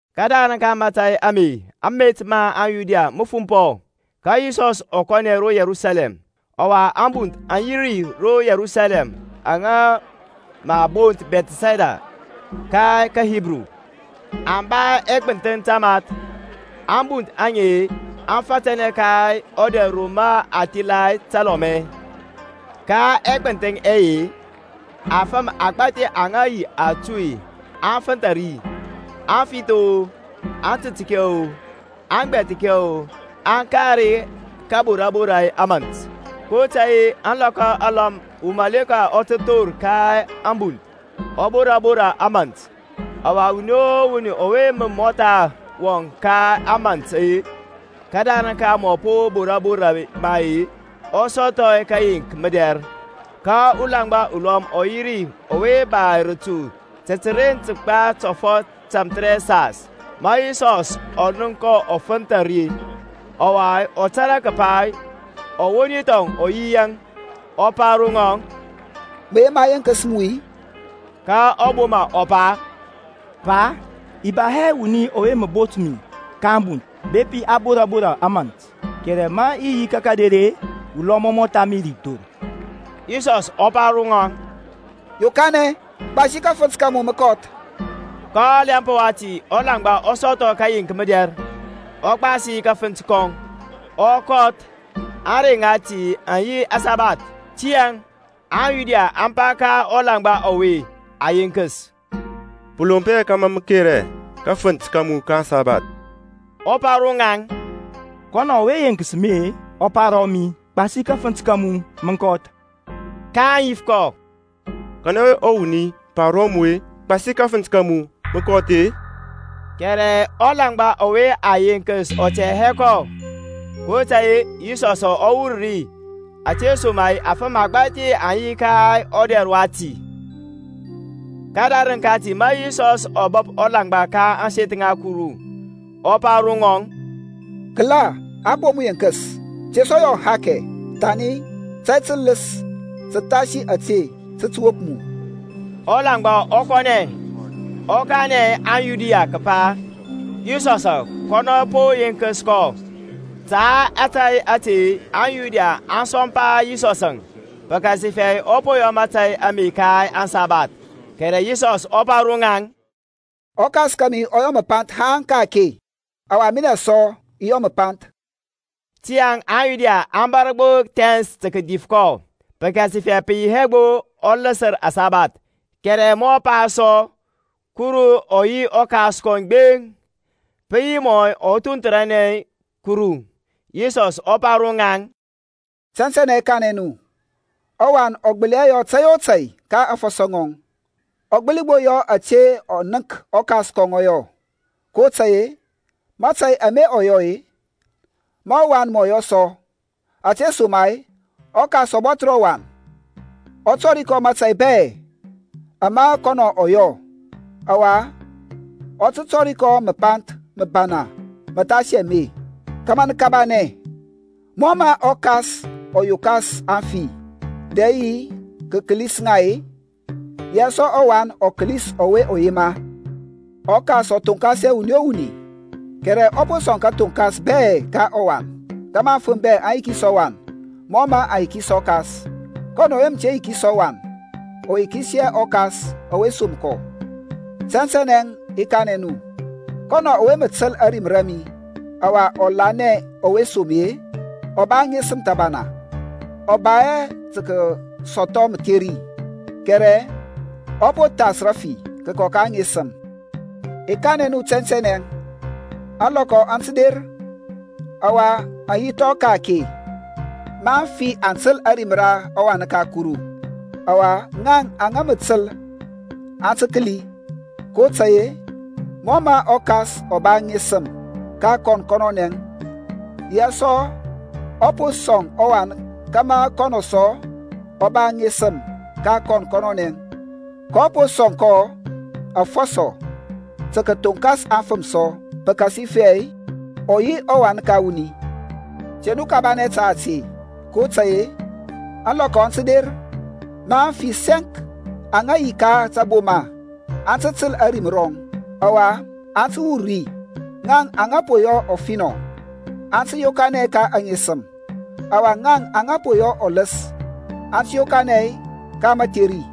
Kədarəŋ ka mȧtȧy ame met ma aŋYuda mə fumpɔ: ka Yisɔs ɔ kɔnɛ ro Yerusalɛm. Ɔwa abunth aŋ yi ro Yerusalɛm aŋa mə a bont Bɛthɛsda ka kaHibru, aŋ ba ɛgbənthəŋ tamath. Ambunth aŋe aŋ fȧtȧnɛ ka ɔdɛr ro ma thila təlɔmɛ. Ka ɛgbənthəŋ ɛye-e, afəm agbȧthi aŋa yi atuy aŋ fənthȧ ri, afith-o, atətkɛ-o, agbɛba-o, aŋ kar kȧborȧ borȧ ka ȧmȧnt. kotȧy-e alɔkɔ alɔm wurɔ ɔ tə thor ka ȧŋbunth ɔ bora bora ȧmȧnt: ɔwa wuni o wuni ɔwe mə mɔtha wɔŋ ka ȧmȧnt-e kədarəŋ ka a po bora bora ma-e, ɔ sɔthɔ kəyeŋk mədɛr. Ka ulaŋgba ulɔm ɔ yi ri ɔwe ba ratu ta təren kəgba tɔfɔt tamthərɛsas. Ma Yisɔsȧŋ ɔ nənk kɔ ɔ fənthȧ ri-e, ɔwa ɔ tȧrȧ kəpa ɔwoni thɔŋ ɔ yi yaŋ-e, ɔ pa ro ŋɔŋ, Mə yema a yenkəs mu-i? Ka ɔboma ɔ pa, Pa, i ba hɛ wuni ɔwe mə bot mi ka ȧŋbunth bepi a bora bora ȧmȧnt: kɛrɛ ma i yi ka kader-e, ulɔm ɔ mɔtha mi ri thor. Yisɔsȧŋ ɔ pa ro ŋɔŋ, Yokanɛ, gbasi kafənt ka mu mə kɔth. Ka ɔlɛmp wati ɔlaŋgba ɔ sɔthɔ kəyeŋk mədɛr, ɔ gbasi kafənt kɔŋ, ɔ kɔth. Aŋrey ŋati aŋ yi aŋsabath. Tiyȧŋ aŋYuda aŋ pa ka ɔlaŋgba ɔwe a yenkəs, Pə lomp hɛ kȧmȧ mə kera kafənt ka mu ka aŋsabath. Ɔ pa ro ŋaŋ, Kɔnɔ ɔwe yenkəs mi-e, ɔ pa ro mi, Gbasi kafənt ka mu, mə kɔth. kaŋ yif kɔ, Kanɛ yi ɔwuni ɔwe pa ro mu, Gbasi kafənt ka mu, mə kɔth-e? Kɛrɛ ɔlaŋgba ɔwe a yenkəs ɔ tɛ hɛ kɔ; kotȧy-e Yisɔsȧŋ ɔ wur ri, ȧtesoma-e afəm agbȧthi aŋ yi ka ɔdɛr wati. Kədarəŋ kati ma Yisɔsȧŋ ɔ bəp ɔlaŋgba ka ȧŋseth ŋa Kuru, ɔ pa ro ŋɔŋ, Kəla a po mu yenkəs: te sɔ yɔ ahakɛ, thani tȧy tələs təthasi ȧte tə tə wop mu. Ɔlaŋgba ɔ kɔnɛ, ɔ kanɛ aŋYuda kəpa Yisɔsȧŋ kɔnɔ po yenkəs kɔ. Ta ȧtȧy ȧte aŋYuda aŋ sɔmpa Yisɔsȧŋ, pəkasifɛ ɔ po yɔ mȧtȧy ame ka aŋsabath. Kɛrɛ Yisɔsȧŋ ɔ pa ro ŋaŋ, ƆKas kȧmi ɔ yɔ məpanth haŋ ka-ake, ɔwa minɛ sɔ i yɔ məpanth. Tiyȧŋ aŋYuda aŋ bȧr gbo thɛns tə kədif kɔ, pəkasifɛ pə yi hɛ gbo ɔ ləsər aŋsabath, kɛrɛ ma ɔ pa sɔ Kurɔŋ ɔ yi ɔKas kɔŋ gbeŋ-e, pə yi mɔ ɔ thunthəranɛ Kuru. Yisɔsȧŋ ɔ pa ro ŋaŋ, Tɛntɛnɛ i kanɛ nu, ɔWan ɔ gbəli hɛ yɔ tȧy o tȧy ka aŋfɔsɔ ŋɔŋ, ɔ gbəli gbo yɔ ȧte ɔ nənk ɔKas ɔ yɔ: kotȧy-e mȧtȧy ama ɔ yɔ-e, ma ɔWan mɔ yɔ sɔ, Ȧtesoma-e ɔKas ɔ bɔthər ɔWan, ɔ tɔri kɔ mȧtȧy bɛ ama kɔnɔ ɔ yɔ: ɔwa ɔ tə tɔri kɔ məpanth məbana məthasi ame, kȧmȧ nə kabanɛ. Mɔ mə ɔKas ɔ yokas aŋfi, dɛ ɔ kəlis ŋa-e, yaŋ sɔ ɔWan ɔ kəlis ɔwe ɔ yema. ƆKas ɔ thonkas hɛ wuni o wuni, kɛrɛ ɔ po sɔŋ kathoŋkas bɛ ka ɔWan: kȧmȧ afəm bɛ aŋ yikis ɔWan mɔ mə aŋ yikis ɔKas. Kɔnɔ ɔwe mə te yikis ɔWan, ɔ yikis hɛ ɔKas ɔwe som kɔ. Tɛntɛnɛ i kanɛ nu, Kɔnɔ ɔwe mə təl ȧrim ra mi, ɔwa ɔ lanɛ ɔwe som mi-e, ɔ ba aŋesəm thəbana, ɔ ba hɛ tə kəsɔthɔ mətheri; kɛrɛ ɔ po thas rəfi kəkɔ ka aŋesəm. I kanɛ nu tɛntɛnɛ, Ȧŋlɔkɔ aŋ tə der, ɔwa aŋ yi thɔŋ ka-ake, ma aŋfi aŋ tə təl ȧrim ra ɔWan ka Kuru; ɔwa ŋaŋ aŋa mə təl aŋ tə kəli. kotȧy-e mɔ mə ɔKas ɔ ba aŋesəm ka kɔn kɔnɔnɛ, yaŋ sɔ ɔ po sɔŋ ɔWan kȧmȧ kɔnɔ sɔ ɔ ba aŋesəm ka kɔn kɔnɔnɛ; kɔ po sɔŋ kɔ afɔsɔ tə kəthoŋkas afəm sɔ, pəkasifɛ ɔ yi ɔWan ka wuni. Te nu kabanɛ ta ȧte; kotȧy-e ȧŋlɔkɔ aŋ tə der, ma aŋfi sɛŋk aŋa yi ka taboma aŋ tə təl ȧrim rɔŋ, ɔwa aŋ tə wur ri, ŋaŋ aŋa po yɔ ɔfinɔ, aŋ tə yokanɛ ka aŋesəm, ɔwa ŋaŋ aŋa po yɔ ɔləs, aŋ tə yokanɛ ka mətheri.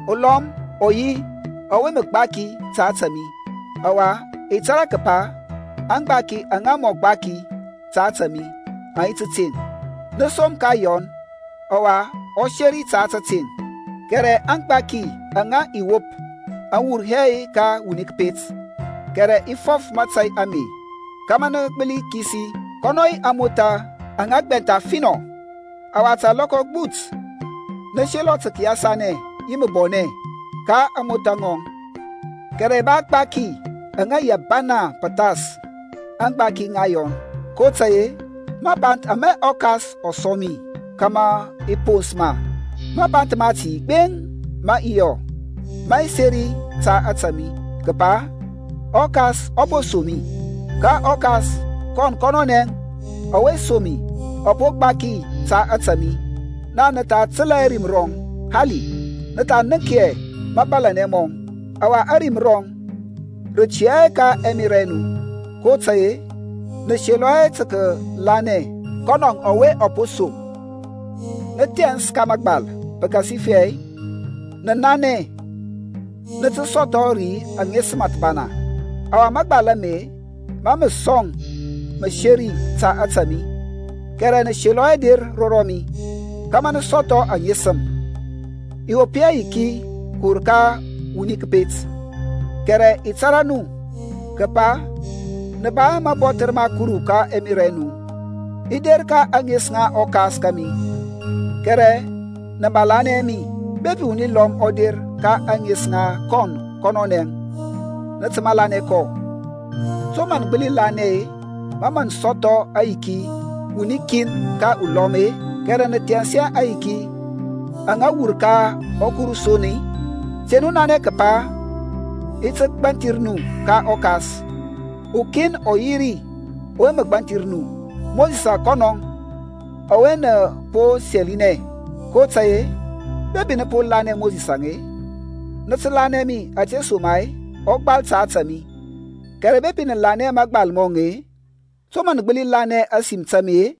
Ulɔm ɔ yi ɔwe mə gbaki ta ȧtȧ mi, ɔwa i tȧrȧ kəpa aŋgbaki aŋa mɔ gbaki ta ȧtȧ mi aŋ yi tȧteŋ. Nə som ka Yɔn, ɔwa ɔ seri ta tȧteŋ. Kɛrɛ aŋgbaki aŋa i wop aŋ wur hɛ ka wuni kəpet; kɛrɛ i fɔf mȧtȧy ame kȧmȧ nə gbəli kisi. Kɔnɔ yi amotha aŋa gbɛntha finɔ, ɔwa ta alɔkɔ agbut nə selɔ tə kəyasanɛ yi məbɔnɛ ka ȧŋmothȧ ŋɔŋ. Kɛrɛ i ba agbaki aŋa yi abana pəthas, aŋgbaki ŋa Yɔn; kotȧy-e mapanth ama ɔKas ɔ sɔŋ mi kȧmȧ i pons ma, mapanth mati gbeŋ ama i yɔ, mə seri ta ȧtȧ mi, kəpa ɔKas ɔ po som mi. Ka ɔKas kɔn kɔnɔnɛ, ɔwe som mi ɔ po gbaki ta ȧtȧ mi. Naŋ nə tha təlȧ hɛ ȧrim rɔŋ hali, nə tha nənk hɛ mȧbȧlȧnɛ mɔŋ. Ɔwa ȧrim rɔŋ rə tiyȧ hɛ ka ɛmerȧ ɛ nu, kotȧy-e nə selɔ hɛ tə kəlanɛ kɔnɔ ɔwe ɔ po som. Nə thɛns ka mȧgbal, pəkasifɛ nə nanɛ nə tə sɔthɔ ri aŋesəm thəbana; ɔwa mȧgbal ame mȧ mə sɔŋ məseri ta ȧtȧ mi. Kɛrɛ nə selɔ hɛ der ro mi, kȧmȧ nə sɔthɔ aŋesəm. I wop hɛ yiki kəwur ka wuni kəpet. Kɛrɛ i tȧrȧ nu, kəpa nə ba hɛ mabɔthər ma Kuru ka ɛmerȧ ɛ nu. I der ka ȧŋes ŋa ɔKas kȧmi, kɛrɛ nə malanɛ hɛ mi; bepi wuni lɔm ɔ der ka ȧŋes ŋa kɔn kɔnɔnɛ, nə tə malanɛ kɔ. To mə nə gbəli lanɛ-e, ma mə nə sɔthɔ ayiki wuni kin ka ulɔm-e, kɛrɛ nə thɛns hɛ aŋyiki aŋa wur ka Kuru son-e? Te nu nanɛ kəpa i ti gbanthir nu ka ɔKas; ukin ɔ yi ri ɔwe mə gbanthir nu, Mosisȧŋ kɔnɔŋ, ɔwe nə po sɛlinɛ. kotȧy-e bepi nə po lanɛ Mosisȧŋ-e, nə tə lanɛ mi; ȧtesoma-e ɔ gbal ta ȧtȧ mi. Kɛrɛ bepi nə lanɛ hɛ mȧgbal mɔŋ-e, to mə nə gbəli lanɛ ȧsim ta mi-e?